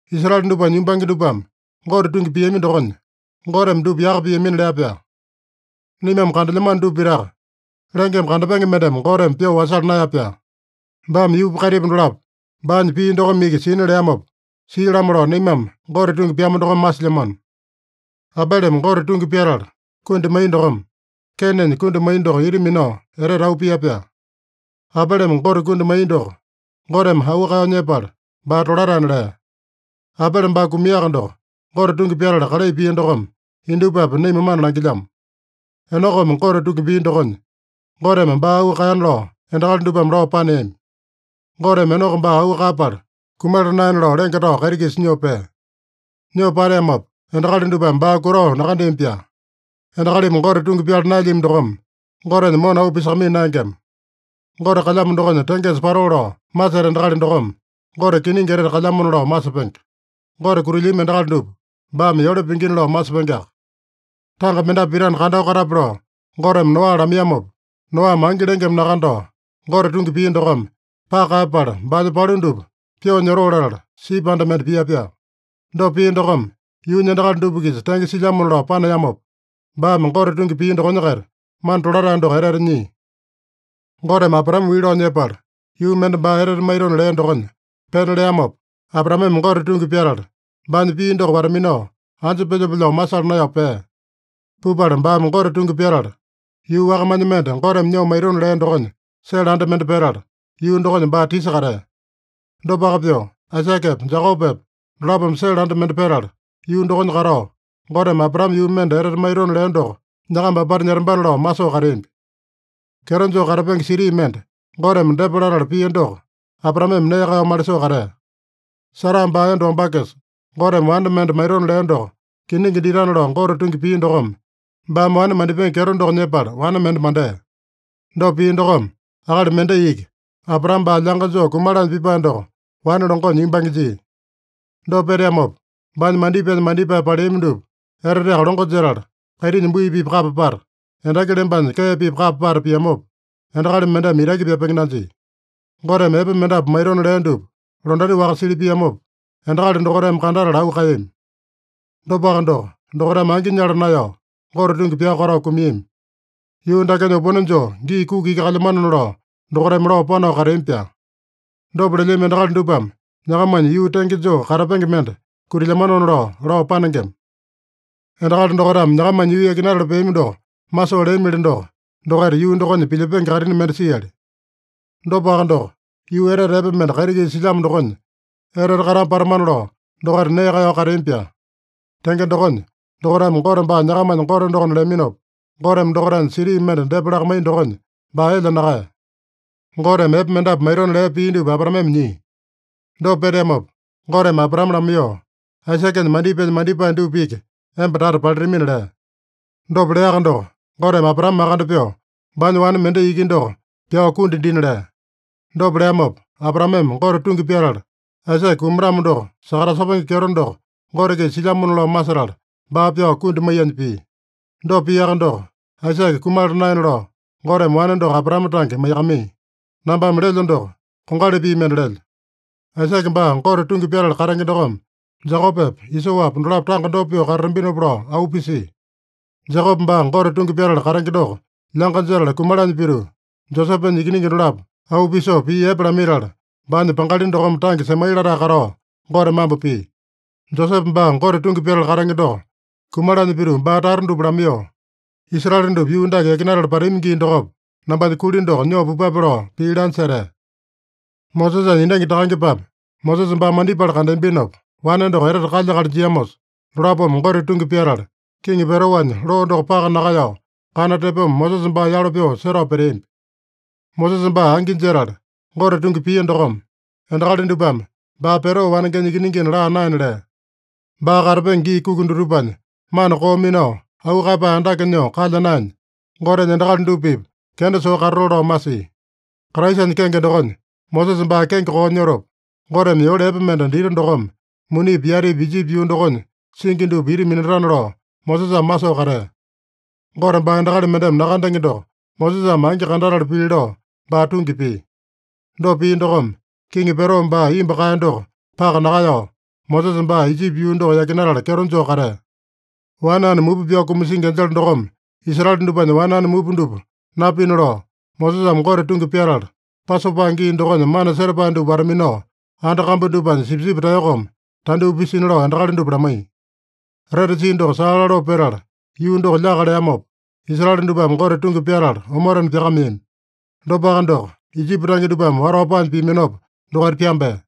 Israele dupanya yumbange dupame Gote tungi piami dokonya, Goteme dupa yaka piamina lea-pyaa. Naimame kandelyamano dupa pitaka, lengeme kandapenge mendeme Goteme pyoo wasala naeya-pyaa. Baame yuupa kaitipa dolapo baanya pii dokome iki sina leamopa sia-lamo lao, naimame Gote tungi pyamu dokome masilyamano. Abeleme Gote tungi pyatala kundi maiya dokome Keinenya kundi maiya doko ita minao etete auu pia-pyaa. Abeleme Gote kundi maiya doko, Goteme auu kaeyao nyepala, baa tolataena lea. Abele baa kumiaka doko, Gote tungi pyatala kalai pia dokome indupapi naima mana langilyamo. Enokome Gote tungi pia dokonya, Goteme baa auu kaeyana lao endakali dupame lao paneami. Goteme Enoko baa auu kaeyapala kumala naena lao lenge tao kaiti-kisa nyoo pea. Nyoo pateamopa endakali dupame baa kutao nakandeami-pyaa. Endakalimi Gote tungi pyala naelyami dokome, Gotenya mona auu pisakamaiya naengema. Gote kalyamo dokonya tengesa patoo lao maseta endakali dokome, Gote kiningi etete kalyamona lao masepenge. Gote kutilyami endakali dupa, baame yole pingina lao masepengeaka. Tanga mendapu pitana kandao katape lao Goteme Noa lamaiyamopa, Noame angi lengeme nakandao, Gote tungi pia dokome paka kaeyapala, baanya palu dupa pyoo nyotoo latala, sipi anda mende pia-pyaa. Dopa pia dokome, yuunya endakali dupa-kisa tenge silyamona lao paneamopa, baame Gote tungi pia dokonya-kaita mana tolatae doko etete nyia. Goteme Abraame wii lao nyepala, yuu mende baa etete maitona lea dokonya pena leamopa, Abraameme Gote tungi pyatala, baanya pii doko wata-minao, anja pelyope lao masala naeyao pea. Pupala baame Gote tungi pyatala, yuu wakamanya mende Goteme nyoo maitona lea dokonya sele anda mende petala, yuu dokonya baa tisa katea. Dopaka pyoo, Aisakepa, Jekopepa dolapome sele anda mende petala, yuu dokonya katao, Goteme Abraame yuu mende etete maitona lea doko nyakamba apata nyetambana lao masoo kateambi. Kyeto joo katapenge siti mende Goteme depa latala pia doko, Abraameme nee kaeyao malisoo katea. Sara baa enda wambakesa, Goteme wane mende maitona lea doko kiningi ditana lao Gote tungi pia dokome, baame wane mandipenge kyeto doko nyepala wane mende mandea. Dopa pia dokome, akali mendai iki, Abraame baa lyanga joo kumalanya pipae doko, wane longonya yumbange jia. Dopa peteamopa, baanya mandipaenya mandipae paleami dupa eteteaka longo jetala, kaitinya bui-pipa kapa pata, endaki lembanya kee-pipa kapa pata piamopa, endakali mendeme itaki pyapenge nanjia. Goteme epe mendapu maitona lea dupa londati-waka sili piamopa, endakali dokaitame kandatala auu kaeyami. Dopaka doko, dokaitame angi nyala naeyao, Gote tungi pyao katao kumiami. Yuu dakenya opone joo gii kuki iki kalyamanona lao, dokaitame lao panao kateami-pyaa. Dopa lelyami endakali dupame nyakamanya yuu tenge joo katapenge mende kutilyamanona lao, lao panengema. Endakali dokaitame nyakamanya yuu yakinatala peami doko masoo leamili doko, dokaita yuu dokonya pilyepenge kaitini mende siali. Dopaka doko, yuu etete epe mende kaiti-kisa silyamo dokonya etete katama patamana lao dokaita nee kaeyao kateami-pyaa. Tenge dokonya, dokaitame Gote baa nyakamanya Gote dokona leaminopa, Goteme dokaitanya siti mende depa lakamaiya dokonya baa elya nakaeya. Goteme epe mendapu maitona lea pii dupa Abraameme nyia. Dopa peteamopa, Goteme Abraame lamaiyoo, “Aisakenya mandipaenya mandipae dupa iki emba tata palitamina” lea. Dopa leaka doko, Goteme Abraame makande pyoo, baanya wane mendai iki doko pyao kundi dina lea. Dopa leamopa Abraameme Gote tungi pyatala, Aisake kumatamo doko sakatasepenge kyeto doko Gote-kisa silyamona lao masetala, baa pyao kundi maiyanya pia. Dopa piaka doko, Aisake kumala naena lao Goteme wane doko Abraame tange maiyakamaiya. Nambame lelyo doko, kongali pii mende lelyo. Aisake baa Gote tungi pyatala katenge dokome Jekopepa, Isoapa dolapo tanga dopa pyoo katatambinopa lao auu pisia. Jekope baa Gote tungi pyatala katenge doko lyanga jetala kumalanya pituu, Josepenya ikiningi dolapo auu pisoo pii epe lamaitala, baanya pangali dokome tange semai latae katao Gote mambo pia. Josepe baa Gote tungi pyatala katenge doko kumalanya pituu baa tata dupa lamaiyoo, “Israele dupa yuu dake yakinatala patami gii dokopa, nambanya kuli doko nyoo pupape” lao pii lanya setea. Mosesanya endangi takangepame Mosesa baa mandipala kandeambinopa, wane doko etete kalya-akali jiamosa, dolapome Gote tungi pyatala, Kiŋi Peroanya loo doko paka nakaeyao, kana tepoma Mosesa baa yalo pyoo setao peteambi. Mosesa baa angi jetala Gote tungi pia dokome, endakali dupame baa Pero wanengenya ikiningina laa naena lea. Baa katapenge gii kuki dutupanya mana koo minao, auu kaeyapae andake nyoo kalya naenya, Gotenya endakali dupa-pipa kenda soo katatoo lao masia. Kraisanya kenge dokonya Mosesa baa kenge koo nyotopa, Goteme yole epe mende dita dokome, munipi yatipi Ijipi yuu dokonya singi dupa ita minatana lao, Mosesame masoo katea. Gote baa endakali mendeme nakandenge doko Mosesame angi kandatala pili lao baa tungi pia. Dopa pia dokome, Kiŋi Pero baa imbu kaeya doko paka nakaeyao, Mosesa baa Ijipi yuu doko yakinatala kyeto joo katea. Wane ane mupa pyao kumasingi enjele dokome Israele dupanya wane ane mupa dupa napina lao, Mosesame Gote tungi pyatala, Pasopa gii dokonya mana setapae dupa wata-minao, anda kambu dupanya sipisipi taeyokome tandyoo pisina lao endakali dupa lamaiya. Retsi doko saa laloo petala yuu doko lyaka leamopa, Israele dupame Gote tungi pyatala omotena pyakameami. Dopaka doko, Ijipi tange dupame watao paanya piaminopa, dokaita pyambea.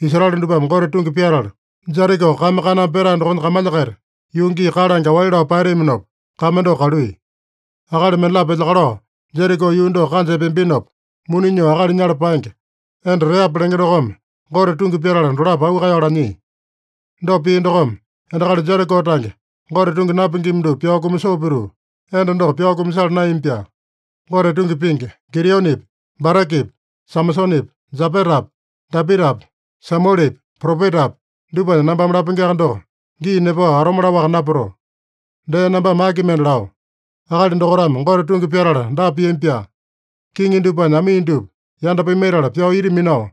Israele dupame Gote tungi pyatala, Jeriko kame kaname petae dokonya kamalya-kaita, yuu gii kalange aowali lao paeteaminopa, kame doko kaluiya. Akali mendalapo elyakalao Jeriko yuu doko kanja epeambinopa, muni nyoo akali nyala paenge, enda Reapa lenge dokome Gote tungi pyatala dolapo auu kaeyao lanyia. Dopa pia dokome, endakali Jeriko tange, Gote tungi napingima dupa pyao kumasoo pituu, enda doko pyao kumasala naeyami-pyaa. Gote tungi pingi, Gideonepi, Barakepi, Samasonepi, Jepetapi, Dapitapi, Samuelepi, propetapi, dupanya nambame lapengeaka doko, gii nepao atome laowaka napatoo. Dee nambame aki mende lao? Akali dokaitame Gote tungi pyatala dapa piami-pyaa: Kiŋi dupanya amii dupa yanda pimaitala pyao ita minao,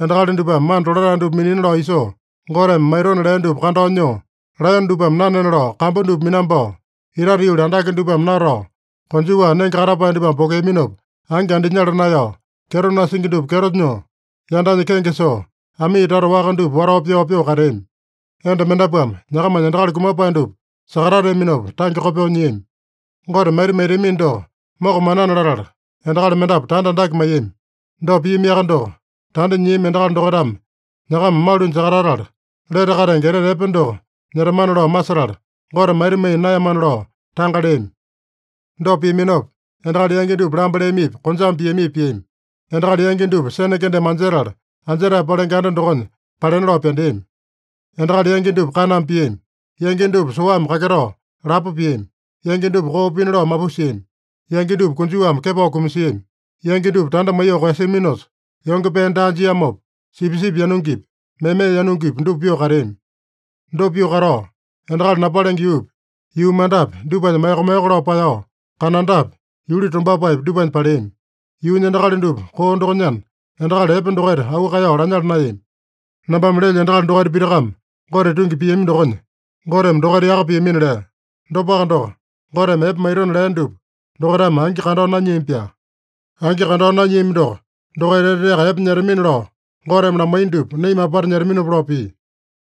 endakali dupame mana tolatae dupa minina lao isoo, Goteme maitona lea dupa kandao nyoo, laeyone dupame nanena lao kambu dupa minambao, itate yuli andake dupame natao, konjuwa nenge katapae dupame pokeaminopa angi andinyala naeyao, kyeto nasingi dupa kyeto nyoo, yandanya kenge soo, amii tata waka dupa watao pyao pyoo kateami. Enda mendapuame nyakamanya endakali kumapae dupa sakatateaminopa tange kopyoo nyiami. Gote maita maitamino doko mokamanana latala, endakali mendapu tanda andake maiyami. Dopa piamiaka doko, tanda nyiami endakali dokaitame nyakama malunya sakatatala, lete katenge etete epe doko nyetamana lao masetala, Gote maita maiya naeyamana lao tanga leami. Dopa piaminopa, endakali yangi dupa lamba leamipi, konjame piamipi piami. Endakali yangi dupa sene kendeme anjetala, anjetae palenge anda dokonya palena lao pyandeami. Endakali yangi dupa kaname piami. Yangi dupa soame kaketao lapo piami. Yangi dupa koo pina lao mapusiami. Yangi dupa konjuwame kepao kumasiami. Yangi dupa tanda maiyoo koeyasiaminosa, yonge pee daa jiamopa, sipisipi yanungipi, meme yanungipi, dupa pyoo kateami. Dopa pyoo katao, endakali napalenge yuupi, yuu mandapi, dupanya maeko-maeko lao paeyao, kanandapi, yuli tombapaepi, dupanya paleami. (Yuunya endakali dupa koo dokonyana, endakali epe dokaita auu kaeyao lanyala naeyami.) Nambame lelyo endakali dokaita pitakame Gote tungi piami dokonya, Goteme dokaita yaka piamina lea. Dopaka doko, Goteme epe maitona lea dupa dokaitame angi kandao nanyiami-pyaa. Angi kandao nanyiami doko, dokaita eteteaka epe nyetamina lao Goteme lamaiya dupa, naima apata nyetaminopa lao pia.